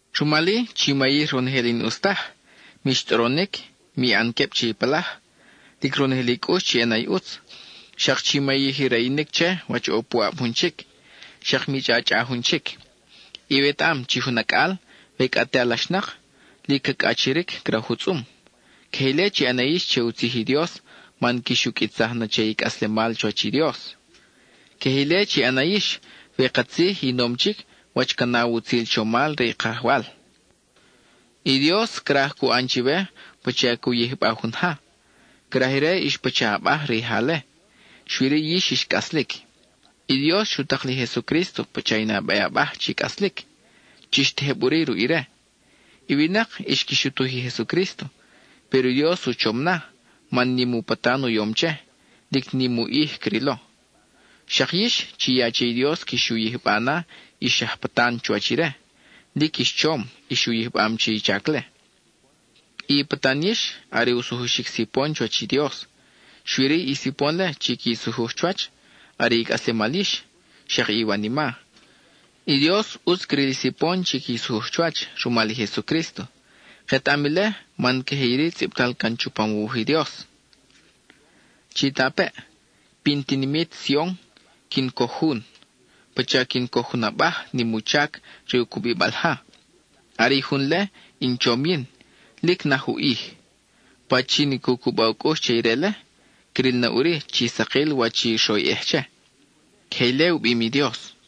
Rumal-i, chi mayij ronojel i n-ʼus taj: mix tʼoronic; mi ʼan queb che i palaj, lic ronojel i cʼux chi ʼana i ʼutz; xak chi mayij i rayinic che, wach ʼo puʼab jun chic; xak mi chʼachʼa jun chic. Iwetaʼam chi jun acʼal, we cʼa te alaxnak, lic ca cʼachiric craj u tzʼum. Queje ile chi ʼana yix che u tzij i Dios man quix u qʼuitsaj na che i cʼaslemal chuwach i Dios. Queje ile chi ʼana yix, we katzij i nom chic wach ca naw utzil chomal re i Kajwal. I Dios craj cu ʼan chiwe pacha cu yijba jun ja; craj ire ix pacha abaj re i ja-le, xui-ri yix ix cʼaslic. I Dios xu tak li Jesucrísto pacha i nabe abaj chi cʼaslic; chix tejeb ʼuri ruʼ ire. I winak xqui xutuj i Jesucrísto, péro i Dios u chom na, man nim u patan u yom che, lic nim u ʼij crilo. Xak yix, chi ya che i Dios quix u yijba na ix aj patan chuwach ire, lic ix chom ix u yijbam che i chac-le. I patan yix, are u sujuxic sipon chuwach i Dios, xui-ri i sipon-le chi qui sujuj chuwach, are i cʼaslemal yix, xak i iwanima. I Dios ʼutz cril i sipon chi qui sujuj chuwach rumal i Jesucrísto. Ketaʼam ile, man queje iri tzʼibtal chupam u wuj i Dios: Chitapeʼ, pin tinimit Sion, quin coj jun, pacha quin coj jun abaj nim u chac re u cubibal ja, are i jun-le, in chom yin, lic naj u ʼij. Pachin i cu cuba u cʼux che ire-le, cril na ʼuri chi sakil wach i xroyʼej che. (Queje ile u bim i Dios.)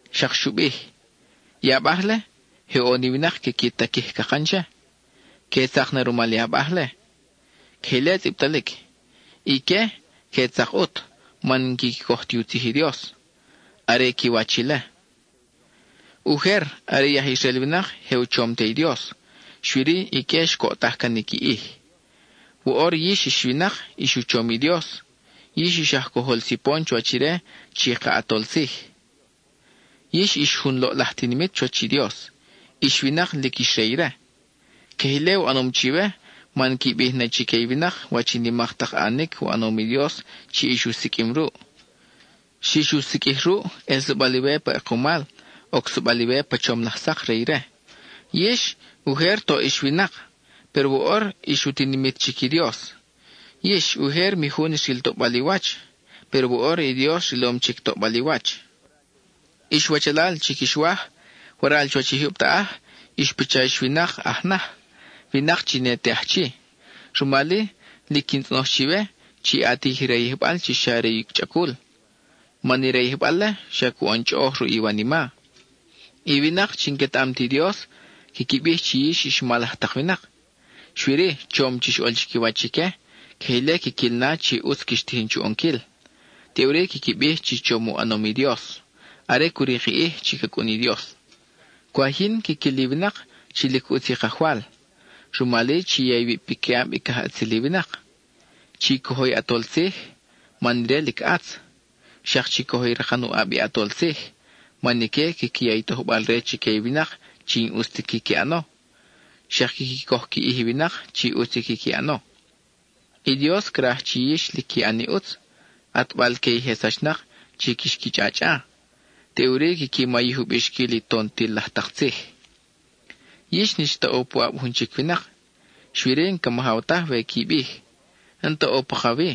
Xak xu bij: I abaj-le, je ʼo ni winak quiqui taquij cakan che; que tzak na rumal i abaj-le. (Queje ile tzʼibtalic.) Ique que tzak ʼut man n-quiqui coj ti u tzij i Dios; are qui wach ile. (Ujer, are i aj Israel winak je u chom te i Dios. Xui-ri, ique xcoʼtaj can i qui ʼij.) Woʼor yix ix winak ix u chom i Dios, yix ix aj cojol sipon chuwach ire chi ka ʼAtol Tzij. Yix ix jun loʼlaj tinimit chuwach i Dios; ix winak lic ix re ire. Queje ile u ʼanom chiwe man qui bij na chique i winak wach i nimak tak ʼanic u ʼanom i Dios chi ix u siqʼuim ruʼ. Xix u siqʼuij ruʼ, ʼelsabal iwe pa ʼekumal, ocsabal iwe pa chom laj sak re ire. Yix, ujer toʼ ix winak, péro woʼor ix u tinimit chic i Dios. Yix, ujer mi jun xril toʼbal i wach, péro woʼor i Dios rilom chic toʼbal i wach. Ix wachalal chi quix waj, waral chuwach i jyub taʼaj, ix pacha ix winak aj naj, winak chi ne te aj chi. Rumal-i, lic quin tzʼonoj chiwe, chi ʼatij i rayijbal chi xa re i chʼacul, man i rayijbal-le xa cu ʼan chʼoʼoj ruʼ i iwanima. I winak chi n-quetaʼam ti Dios, quiqui bij chi yix ix mal laj tak winak. Xui-ri, chom chix ʼol chiquiwach ique, queje ile quiquil na chi ʼutz quix tijin chu ʼonquil; teʼuri quiqui bij chi chom u ʼanom i Dios, are cu rik i ʼij chi ca cʼun i Dios. Cwaj yin quiquil i winak chi lic ʼutz i Kajwal, rumal-i chi ya iwib piquiʼab i cajʼatzil i winak. Chi cojo i ʼatol tzij, man ire lic ʼatz, xak chi cojo i rakan u ʼab i ʼatol tzij, man ique quiqui ya i tojbal-re chique i winak chi n-ʼus ti quiqui ʼano, xak quiqui coj qui ʼij i winak chi ʼutz i quiqui ʼano. I Dios craj chi yix lic qui ʼan i ʼutz, ʼatbal-que i je sachnak chi quix qui chʼachʼa; teʼuri quiqui mayij u bixquil i tontil laj tak tzij. Yix n-ix ta ʼo puʼab jun chic winak, xui-ri n-ca majaw taj we qui bij, “N-ta ʼo pakawi,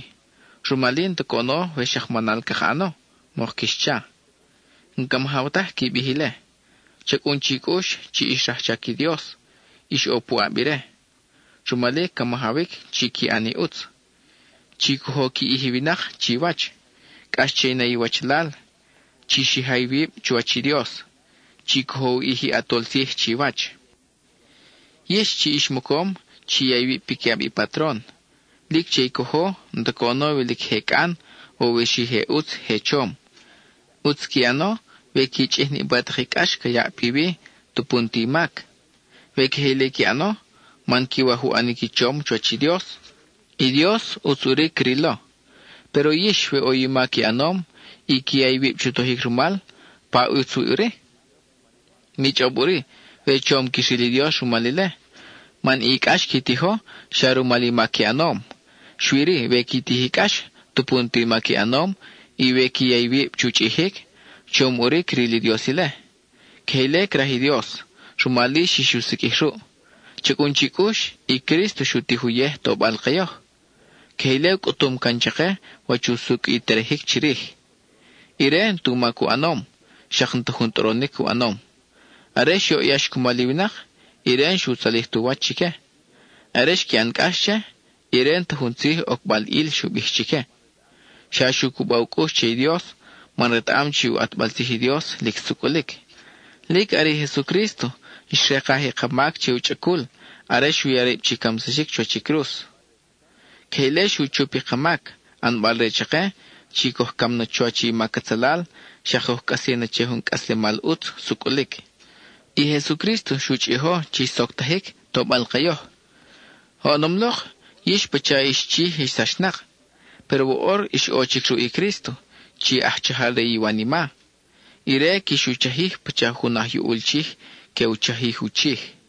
rumal-i n-ta coʼono we xak manal caka ʼano,” mok quix cha. N-ca majaw taj qui bij ile. Cha cʼun chi cʼux chi ix rajchac i Dios, ix ʼo puʼab ire; rumal-i ca majawic chi qui ʼan i ʼutz. Chi cojo qui ʼij i winak chiwach: cʼax che i na i iwachalal; chi xija iwib chuwach i Dios; chi cojo u ʼij i ʼatol tzij chiwach. Yix, chi ix mocom, chi ya iwib piquiʼab i patron; lic che i cojo n-ta coʼono we lic je cʼan, o we je ʼutz je chom. ʼUtz qui ʼano we qui chʼij niʼpa tak i cʼax ca yaʼ piwi tupu n-ta i mac. We queje ile qui ʼano man quiwaj u ʼanic i chom chuwach i Dios, i Dios ʼutz ʼuri crilo. Péro yix, we ʼo i mac i ʼanom, y qui ya iwib chu tojic rumal, ¿pa ʼutz wi ʼuri? Mi chʼob ʼuri we chom quix ril i Dios rumal ile, man i cʼax xi tijo, xa rumal i mac i ʼanom. Xui-ri, we qui tij i cʼax tupu n-ta mac i ʼanom, y we qui ya iwib chu chʼijic, chom ʼuri cril i Dios ile. Queje ile craj i Dios, rumal-i xix u siqʼuij ruʼ. Cha cʼun chi cʼux, i Crísto xu tij uyej tobal ke yoj. Queje ile u cʼutum can chake wach usucʼ i terejic chirij. Ire, n-tu mac u ʼanom, xak n-ta jun tʼoronic u ʼanom. Are xyoʼyax cumal i winak, ire n-xu tzalij tu wach chique. Are xqui ʼan cʼax che, ire n-ta jun tzij ocbal ʼil xu bij chique; xa xu cuba u cʼux che i Dios, man retaʼam chi u ʼatbal tzij i Dios lic sucʼulic. Lic are i Jesucrísto xrekaj i ka mac che u chʼacul are xu ya rib chi camsaxic chuwach i cruz. Queje ile xu chup i ka mac, ʼanbal re chake chi coj cam na chuwach i mac atzalal, xak coj cʼasi na che jun cʼaslemal ʼutz sucʼulic. I Jesucrísto xu chʼijo chi xsoctajic tobal ke yoj. Oʼonom lok, yix pacha ix chij ix sachnak, péro woʼor ix ʼo chic ruʼ i Crísto, chi aj chajal re i iwanima. Ire quix u chajij pacha jun aj yuʼul chij chi que u chajij u chij.